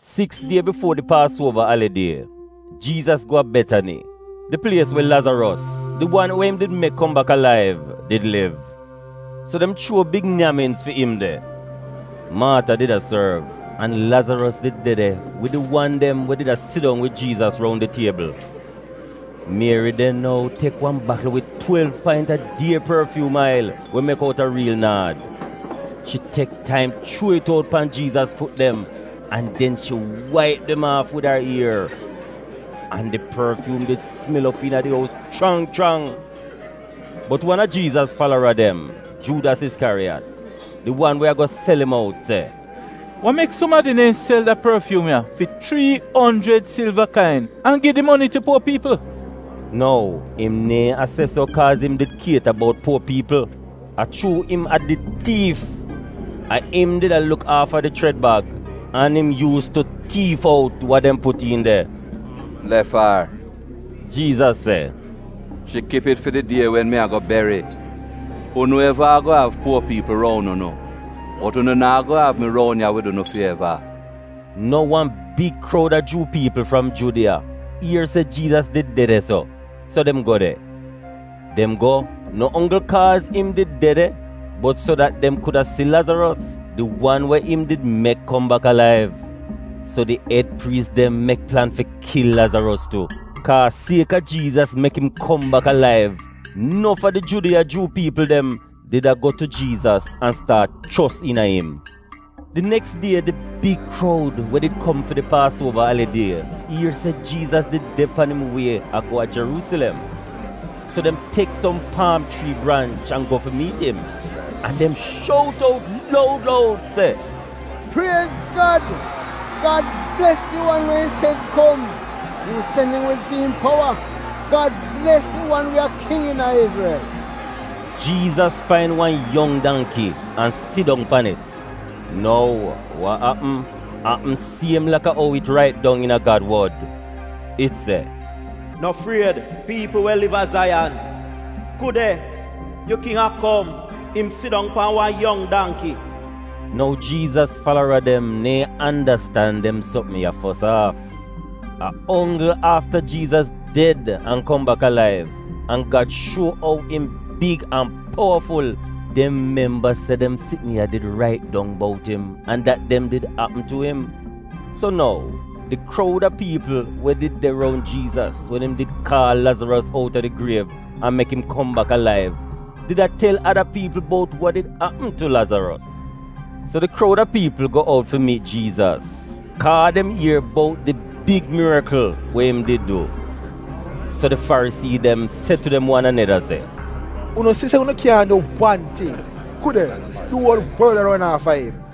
Siks die bifuo di Paasuova Alidie, Jiizas go a Betani, di plies we Lazaros, di wan we im did mek kom bak alaiv, did liv. So dem chuo big nyaminz fi im de. Maata did a sorv, an Lazaros did de de wid di wan dem we did a sidong wid Jiizas roun di tiebl. Mieri den nou tek wan bakl wid twelv paint a dier porfyuum ail we mek outa riil naad. Shi tek taim chuo it out pan Jiizas fut dem an den shi waip dem aaf wid ar ier. (An di porfyuum did smel op iina di ous chrang chrang.) Bot wan a Jiizas falara dem, Juudas Iskyariyat, di wan we ago sel im out se, “Wa mek sumadi neehn sel da porfyuum ya fi chrii onjrid silva kain an gi di moni tu puo piipl?” (Nou, im neehn a se so kaaz im did kieta bout puo piipl; a chuu im a did tiif. A im did a luk aafa di chred bag, an im yuus tu tiif out wa dem put iin de.) “Lef ar,” Jiizas se, “shi kip it fi di die wen mi ago beri. Unu eva ago av puo piipl roun unu, bot unu naa go av mi roun ya wid unu fi eva.” Nou wan big kroud a Juu piipl fram Judiya ier se Jiizas did de de-so, so dem go de. Dem go, no onggl kaaz im did de de, bot so dat dem kuda si Lazaros, di wan we im did mek kom bak alaiv. So di ed priis dem mek plan fi kil Lazaros tu, kaa sieka Jiizas mek im kom bak alaiv nof a di Judiya Juu piipl dem did ago tu Jiizas an staat chos iina im. Di neks die di big kroud we did kom fi di Paasuova Alidie ier se Jiizas did de pan im wie a go a Jeruusilem. So dem tek som paam chrii branch an go fi miit im, an dem shout out loud loud se, “Priez Gad!” “Gad bles di wan we im sen kom!” im sen im wid fi'im powa!” “Gad bles di wan we a king iina Izrel!” Jiizas fain wan yong dangki an sidong pan it. Nou wa apm, apm siem laka ou it rait dong iina Gad wod. It se, “No fried, piipl we liv a Zaiyan; ku de, yu King a kom, im sidong pan wan yong dangki.” (Nou Jiizas falara dem neehn andastan dem sopm ya fos aaf. A onggl afta Jiizas ded an kom bak alaiv an Gad shuo ou im big an powaful dem memba se dem sitn ya did rait dong bout im an dat dem did apm tu im.) So nou, di kroud a piipl we did de roun Jiizas wen im did kaal Lazaros outa di griev an mek im kom bak alaiv did a tel ada piipl bout wa did apm tu Lazaros. So di kroud a piipl go out fi miit Jiizas, kaa dem ier bout di big mirikl we im did du. So di Farisii dem se tu dem wan aneda se, “Unu si se unu kyaahn du wan ting. Ku de, di uol worl a ron aafa im!”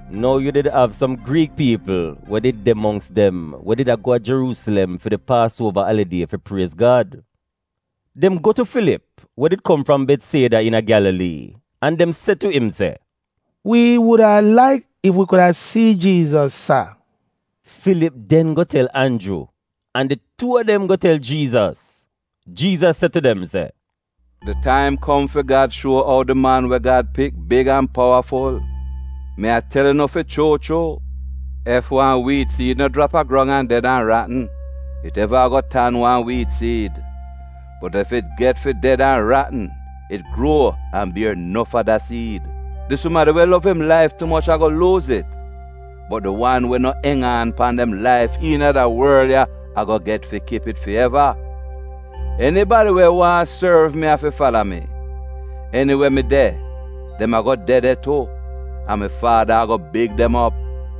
Nou yu did av som Griik piipl we di de mongks dem we did a go a Jeruusilem fi di Paasuova Alidie fi priez Gad. Dem go tu Filip, we did kom fram Betsieda iina Gyalalii, an dem se tu im se, “Wi wuda laik ef wi kuda si Jiizas, sar.” Filip den go tel Anju, an di tuu a dem go tel Jiizas. Jiizas se tu dem se, “Di taim kom fi Gad shuo ou di Man we Gad pik big an powaful. Mi a tel unu fi chuu chuu, ef wan wiit siid no jrap a grong an ded an ratn, it neva ago tan wan wiit siid. Bot ef it get fi ded an ratn, it gruo an bier nof ada siid. Di sumadi we lov im laif tu moch ago luuz it, bot di wan we no eng aan pan dem laif iina da worl ya ago get fi kip it fi eva. Enibadi we waahn sorv mi afi fala mi. Eniwe mi de, dem ago de de tu, an mi Faada ago big dem op.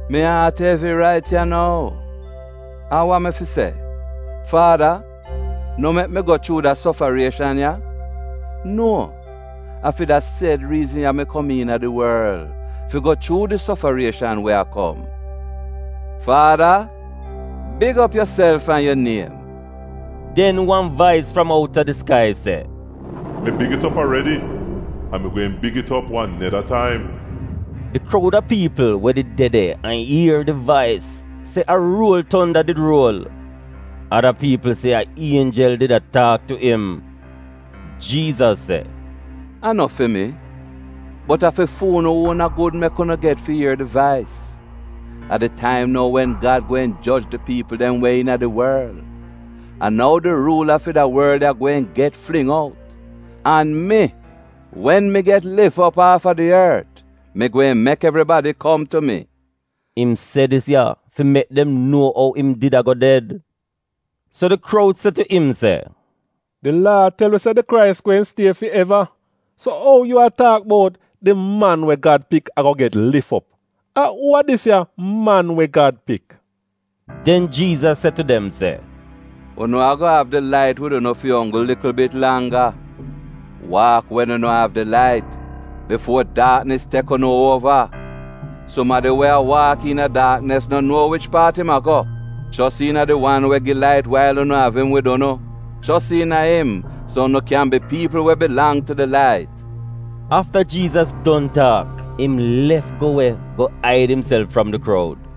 Mi aat evi, rait ya nou. An wa mi fi se? ‘Faada, no mek mi go chuu da sofarieshan ya?’ Nuo! A fi da sed riizn ya mi kom iina di worl — fi go chuu di sofarieshan we a kom. Faada, big op yuself an yu niem!” Den wan vais fram outa di skai se, “Mi big it op aredi, an mi gweehn big it op wan neda taim.” Di kroud a piipl we did de de an ier di vais se a ruol tonda did ruol. Ada piipl se a ienjel did a taak tu im. Jiizas se, “A no fi mi, bot a fi fu'unu uona gud mek unu get fi ier di vais. A di taim nou wen Gad gweehn joj di piipl dem we iina di worl; a nou di ruula fi da worl ya gweehn get fling out. An mi, wen mi get lif op aafa di ort, mi gweehn mek evribadi kom tu mi.” (Im se dis ya fi mek dem nuo ou im did ago ded.) So di kroud se tu im se, “Di Laa tel wi se di Krais gweehn stie fi eva, so ou yu a taak bout, ‘Di Man we Gad Pik ago get lif op’? A uu a dis ya ‘Man we Gad Pik’?” Den Jiizas se tu dem se, “Unu ago av di lait wid unu fi onggl likl bit langga. Waak wen unu av di lait, bifuo daaknis tek unu uova. Sumadi we a waak iina daaknis no nuo wich paat im a go. Chos iina di wan we gi lait wail unu av im wid unu, chos iina im so unu kyan bi piipl we bilang tu di lait.” Afta Jiizas don taak, im lef go we go aid imself fram di kroud.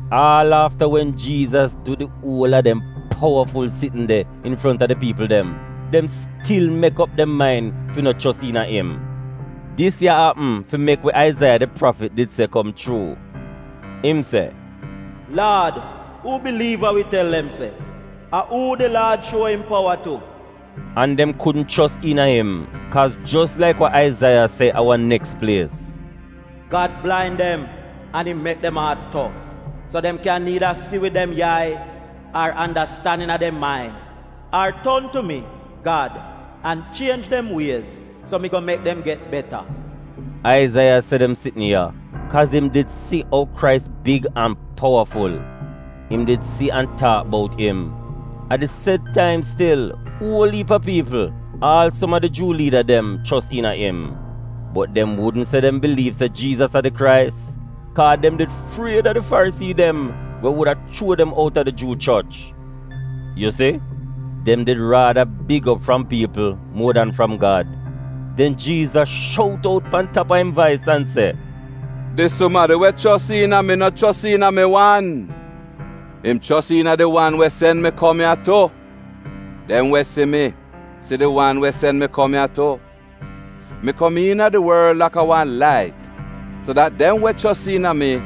Aal afta wen Jiizas du di uol a dem powaful sitn de infronta di piipl dem, dem stil mek op dem main fi no chos iina im. Dis ya apm fi mek we Aizaiya di prafit did se kom chuu. Im se, “Laad, uu biliiv wa wi tel dem se? A uu di Laad shuo im powa tu?” An dem kudn chos iina im kaaz jos laik wa Aizaiya se a wan neks plies, “Gad blain dem an im mek dem aat tof, so dem kyan niida si wid dem yai, ar andastan iina dem main, ar ton tu mi, Gad, an chienj dem wiez fi mi go mek dem get beta.” Aizaiya se dem sitn ya, kaaz im did si ou Krais big an powaful. Im did si an taak bout im. A di sed taim stil, uol iip a piipl, aal som a di Juu liida dem, chos iina im. Bot dem wudn se dem biliiv se Jiizas a di Krais, kaa dem did fried a di Farisii dem we wuda chuo dem outa di Juu choch. Yu si, dem did rada big op fram piipl muo dan fram Gad. Den Jiizas shout out pan tap a im vais an se, “Di sumadi we chos iina mi no chos iina mi wan, im chos iina di wan we sen mi kom ya tu. Dem we si mi, si di wan we sen mi kom ya tu. Mi kom iina di worl laka wan lait, so dat dem we chos iina mi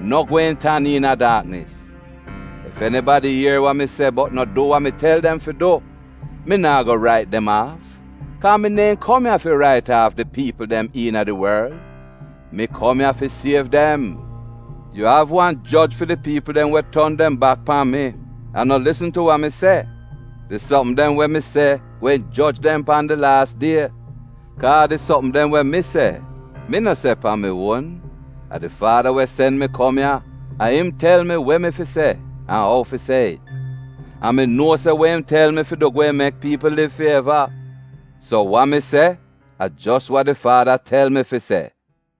no gweehn tan iina daaknis. Ef enibadi ier wa mi se bot no du wa mi tel dem fi du, mi naa go rait dem aaf, kaa mi neehn kom ya fi rait aaf di piipl dem iina di worl; mi kom ya fi siev dem. Yu av wan joj fi di piipl dem we ton dem bak pan mi, an no lisn tu wa mi se. Di sopm dem we mi se gweehn joj dem pan di laas die. Kaa di sopm dem we mi se, mi no se pan mi uon, a di faada we sen mi kom ya, a im tel mi we mi fi se an ou fi se it. An mi nuo se we im tel mi fi du gweehn mek piipl liv fi eva. So wa mi se a jos wa di Faada tel mi fi se.”